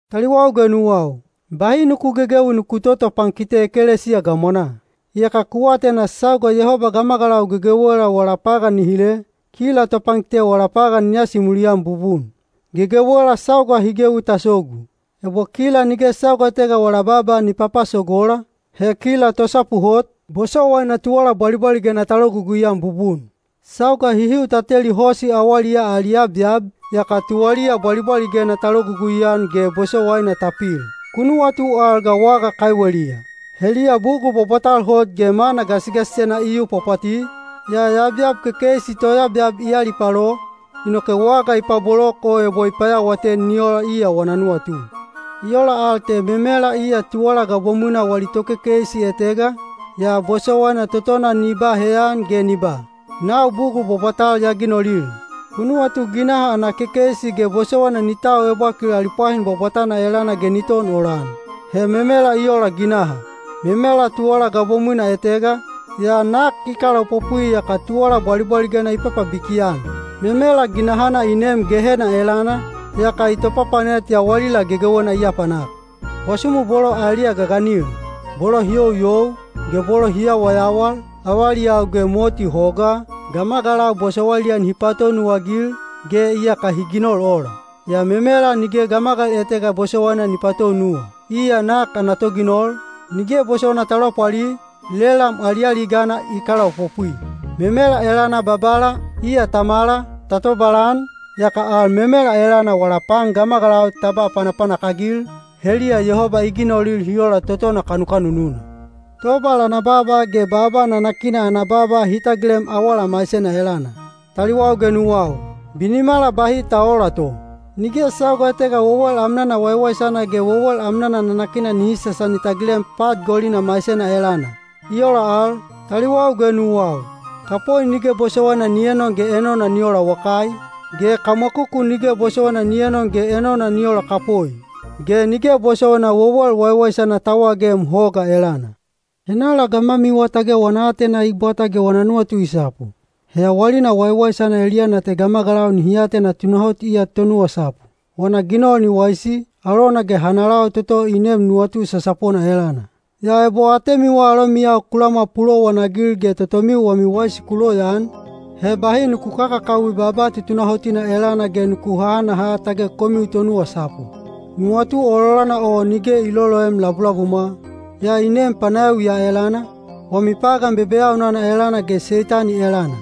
Taliwau ge nuwau, bahi nuku gegewi nuku totopankite ekelesiya gamwanaa. Iyaka ku atena sauga Yehoba gamagalau gegewela wala pagan ni hile, kila topankite wala pagan ni asimuli-an bubun. Gegewela sauga hi gewi ta sogu. Ebo kila nige sauga etega wala baaba ni papasogola, he kila tosapu hot, bosowaina tuwala bwalibwaligena ta logugui-an bubun. Sauga hihiu ta teli hosi awaliyaa ali yabyab, yaka tuwaliya bwalibwaligena ta logugui-an ge bosowaina ta pil. Ku nuwatu al ga waga kaiweliya. Heliya bugul bwabwatal hot ge mana gasigasisena i yu pwapwati, yaa yabyab kekeisi toyabyab i alipalo, inoke waga i pabolok o ebo i payawaten ni ola iya wana nuwatu. I ola al te memela iya tuwala gabomwina wali tokekeisi etega, yaa bosowaina totona ni ba heyan ge ni ba, “Nau bugul bwabwatal ya ginolil.” Ku nuwatu ginaha ana kekeisi ge bosowaina ni tau ebwakil ali pwahin bwabwatana elana ge ni ton olan. He memela i ola ginaha. Memela tuwala gabomwina etega, yaa nak i kalaopopwi yaka tuwala bwalibwaligena i papabiki-an. Memela ginahana i neem Gehena elana, yaka i topapanet yawalila gegewena i apanak. Bwasumu bolo aeliya gaganil, bolo hi youyou, ge bolo hi yawayawal, avaliyau ge moti hogaa, gamagalau bosowailiya nihi patounuwa-agil, ge iyaka hi ginol ola. Yaa memela nige gamagal etega bosowaina ni patounuwa. Iya nak ana toginol, nige bosowaina ta lopwali, lelam alialigana i kalaopopwi. Memela elana Babala, iya Tamala, ta tobalan, yaka al memela elana wala pan gamagalau ta ba panapanak-agil, heliya Yehoba i ginolil hi ola totona kanukanununa. Tobal ana baaba ge baaba nanakina ana baaba hi tagilem awala maisena elana. Taliwau ge nuwau, binimala bahi ta oola to. Nige sauga etega wewel amnana waiwaisana ge wewel amnana nanakina nihi sasani tagilem pat golina maisena elana. I ola al, taliwau ge nuwau, kapoi nige bosowaina ni enon ge enona ni ola wakai, ge kamwakuku nige bosowaina ni enon ge enona ni ola kapoi. Ge nige bosowaina wewel waiwaisana ta wagem hoga elana. Henala gamwamiwa tage wana aatena i bwata ge wana nuwatu i sapu? He yawalina waiwaisana eliyana te gamagalau nihi atena tunahot iya tonuwasapu. Wana ginol ni waisi, alona ge hanalau toto i neem nuwatu sasapona elana. Yaa ebo atemiwa alomiyau ku lamwa pulowanagil ge totomiu wami waisi ku loyaan, he bahi nuku kakakawi baaba tutunahotina elana ge nuku hahanaha tage komiu tonuwasapu. Nuwatu ololana o nige i loloem labulabumwa, yaa i neem panayawi ya elana, wami pagan bebeyaunana elana ge Seitani elana.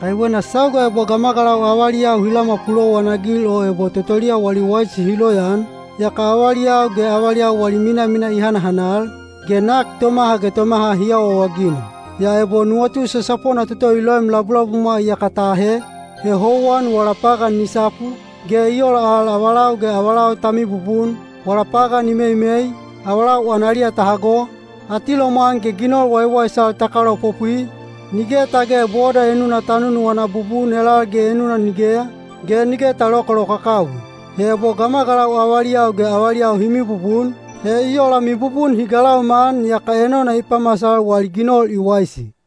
Kaiwena sauga ebo gamagalau avaliyau hi lamwa pulowanagil o ebo totoliya wali waisi hi loyaan, yaka avaliyau ge avaliyau wali minamina i hanahanal, ge nak tomaha ge tomaha hi awaawaginol. Yaa ebo nuwatu sasapona toto i loem labulabumwa iyaka ta ahe, he houwan wala pagan i sapu, ge i ola al avalau ge avalau ta mibubun, wala pagan i meimei, avalau analiya ta hago, atilomwan ge ginol waiwaisal ta kalaopopwi, nige tage boda enuna ta nunuwana bubun elal ge enuna nigeya, ge nige ta lokalokakawi. He ebo gamagalau avaliyau ge avaliyau hi mibubun, he i ola mibubun hi galauma-an yaka enona i pamasal wali ginol i waisi.